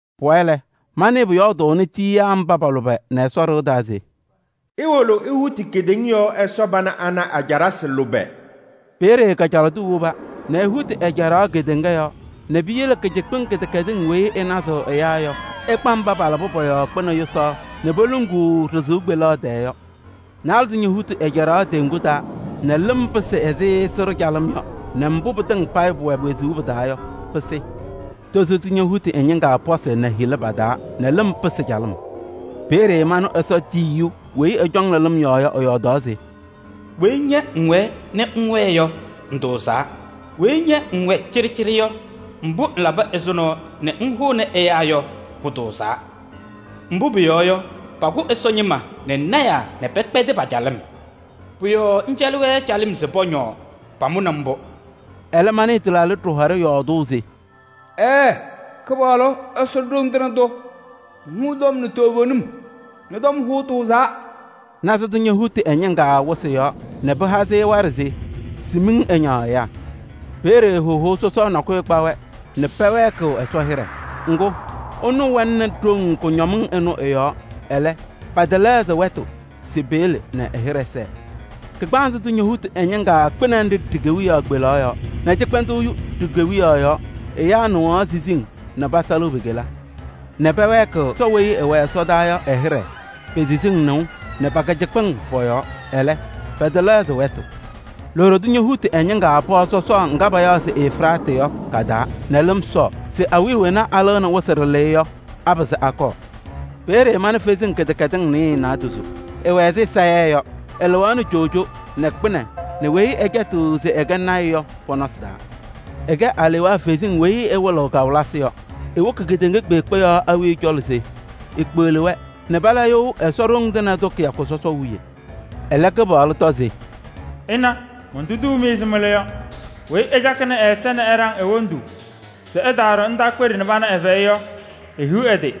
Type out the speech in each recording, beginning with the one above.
Pʋwayɩ lɛ, manɩɩ pʋyɔɔdʋʋnɩ tiyiyaa mba pa-lʋbɛ nɛ Ɛsɔ ɖɩɣa taa se: “Iwolo ihuti kedeŋa yɔɔ Ɛsɔ pana ana a-caɖasɩ lʋbɛ!” Peeye kajalaɣ tʋ woba nɛ ehuti ɛ-caɖaɣ kedeŋa yɔɔ nɛ piyele kɩcɩkpɩŋ kɩdɛkɛdɩŋ weyi ɩnazɩɣ ɛyaa yɔ, ɩkpa mba palabɩ pɔ-yɔɔ kpɩnɛ yʋsaɣ nɛ poluŋuu ɖɩ-sɩʋ kpeleɣ tɛɛ yɔ. Naalɛ tʋ ñohuti ɛ-caɖaɣ teŋgu taa nɛ lɩm pɩsɩ ɛzɩ sɩɖʋ calɩm yɔ nɛ mbʋ pɩtɩŋa pʋwɛ wezuu pɩ-taa yɔ, pɩsɩ. Tozo tʋ ñohuti ɛ-ñɩŋga pɔsɩ nɛ hila pa-taa nɛ lɩm pɩsɩ calɩm. Peeye manɩ Ɛsɔ tiyiyu weyi ɛcɔŋnɩ lɩm yɔɔ yɔ, ɛyɔɔdaɣ se: “Weyi ña ŋwɛɛ nɛ ŋŋwɛɛ yɔ, ŋtʋʋzaa. Weyi ña ŋwɛ cɩɖɩcɩɖɩ yɔ, mbʋ ŋlaba ɛzʋnɔ nɛ ŋhʋnɩ ɛyaa yɔ, pʋtʋʋzaa. Mbʋ pʋyɔɔ yɔ, pakʋ Ɛsɔ ñɩma nɛ lɔɔyɩsɩ tɩnaa nɛ pɛkpɛdɩ pa-calɩm. Pʋ-yɔɔ ŋcɛlɩ-wɛ calɩm se pɔñɔɔ, pamʋnɩ mbʋ.” Ɛlɛ manɩɩ tɩlaaɖɩ ɖɩhɔɖɛ yɔɔdʋʋ se: “Ɛɛ, Kɩpaɣlʋ Ɛsɔ Ɖoŋ Tɩŋa Tʋ! Ŋhʋʋ tɔm nɛ toovenim, ñɔ-tɔm hʋʋ tʋʋzaa.” Naanza tʋ ñohuti ɛ-ñɩŋga wɩsɩ yɔɔ nɛ paha-sɩ waɖɛ se sɩhɔ ɛyaa miŋ. Peeye hohou sɔsɔʋ nakʋyʋ kpa-wɛ nɛ pɛwɛɛkɩɣ Ɛsɔ hɩɖɛ. Ŋgʋ, ɛnʋ wɛnɩnɩ ɖoŋ kʋñɔmɩŋ ɩnʋ ɩ-yɔɔ. Ɛlɛ, pɛtɛlɛɣzɩ wɛtʋ se peyele nɛ ɛ-hɩɖɛ sɛɛ. Kagbaanzɩ tʋ ñohuti ɛ-ñɩŋga kpɩnɛ nɖɩ ɖi-kewiyaɣ kpelaɣ yɔɔ nɛ cɩkpɛndʋʋ yu ɖi-kewiyaɣ yɔɔ. Ɛyaa nɩɣaɣ siziŋ nɛ pasalɩɣ pe-kela nɛ pɛwɛɛkɩɣ Ɛsɔ weyi ɛwɛ ɛsɔdaa yɔ ɛ-hɩɖɛ pe-siziŋ nɩʋ nɛ pa-kɩcɩkpɩŋ pɔ-yɔɔ. Ɛlɛ, pɛtɛlɛɣzɩ wɛtʋ. Loɖo tʋ ñohuti ɛ-ñɩŋga pɔɔ sɔsɔɔ ŋga payaɣ se Efiraatɩ yɔ ka-taa nɛ lɩm sɔɔ se awiya wena alɩɣnɩ wɩsɩ ɖɩlɩyɛ yɔ, apɩzɩ akɔɔ. Peeye mana kalɩzasɩ kɩdɛkɛdɩsɩ nasɩyɩ naadozo, sɩwɛ ɛzɩ sayɛɛ yɔ. Sɩlɩɣaɣnɩ coojo nɛ kpɩnɛ nɛ weyi ɛcɛtɩɣ se ɛkɛ lɔɔyaɣ tʋ yɔ pɔ-nɔsɩ taa. Sɩkɛ alewaa kalɩzasɩ nzɩ sɩwɩlɩɣ kawɩlɩsɩ yɔ. Siwoki kedeŋa kpeekpe yɔɔ awiya cɔlɔ se sikpeɣli-wɛ nɛ pala you nɛ Ɛsɔ Ɖoŋ Tɩŋa Tʋ kɩyakʋ sɔsɔʋ wiye. Ɛlɛ Kɩpaɣlʋ tɔ se: “Ɩna, montuduu-mɩ ɛzɩ mɩlʋ yɔ. Weyi ɛcakɩnɩ ɛ-ɛza nɛ ɛɖaŋ e-wondu se ɛtaaɖɔ ndaakpeɖe nɛ pana ɛ-fɛyɛ yɔ, ehiɣ ɛ-tɩ!”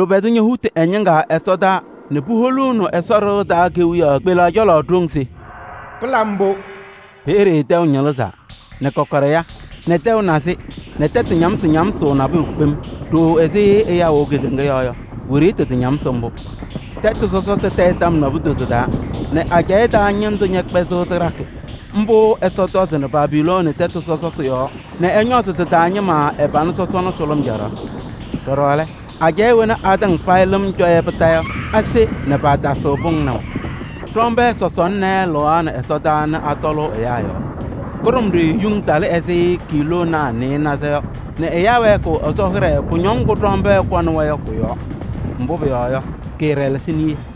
Lʋbɛ tʋ ñohuti ɛ-ñɩŋga ɛsɔdaa nɛ puholuuni Ɛsɔ ɖɩɣa taa kewiyaɣ kpelaɣ cɔlɔ ɖoŋ se: “Pɩlabɩ mbʋ!” Peeye tɛʋ ñɩlɩzaa nɛ kɔkɔɖɛ ya nɛ tɛʋ nazɩ nɛ tɛtʋ ñamsɩ ñamsʋʋ nabʋyʋ kpem. Ɖooo ɛzɩ ɛyaa wɛʋ kedeŋa yɔɔ yɔ, wiɖiyi tɩtañamsɩ mbʋ. Tɛtʋ sɔsɔtʋ tayɩ tɔm naadozo taa nɛ ajɛɛ taa ñɩndʋ ñɛkpɛzɩɣ tɩɖakɩ. Mbʋ Ɛsɔ tɔzɩnɩ Babilooni tɛtʋ sɔsɔtʋ yɔɔ nɛ ɛñɔzɩ tɩ-taa ñɩma ɛ-pana sɔsɔna sʋlʋm caɖaɣ. Ɖɔɖɔ lɛ, ajɛɛ wena atɩŋa payɩ lɩm cɔ-yɛ kondiko yɔ, ase nɛ paatasɩɣ pʋŋ naʋ. Ɖɔmbɛɛ sɔsɔna naayɛ lɩɣaɣnɩ ɛsɔdaa nɛ atɔlʋʋ ɛyaa yɔɔ. Kʋɖʋmɖɩyɛ yuŋ talɩ ɛzɩ kiiloonaa nɩɩnaza yɔ nɛ ɛyaa wɛɛkɩɣ Ɛsɔ hɩɖɛ kʋñɔŋ ŋgʋ ɖɔmbɛɛ kɔnɩ-wɛ yɔ kʋ-yɔɔ. Mbʋ pʋyɔɔ yɔ, kɩɩɖɛlɛsɩ niye.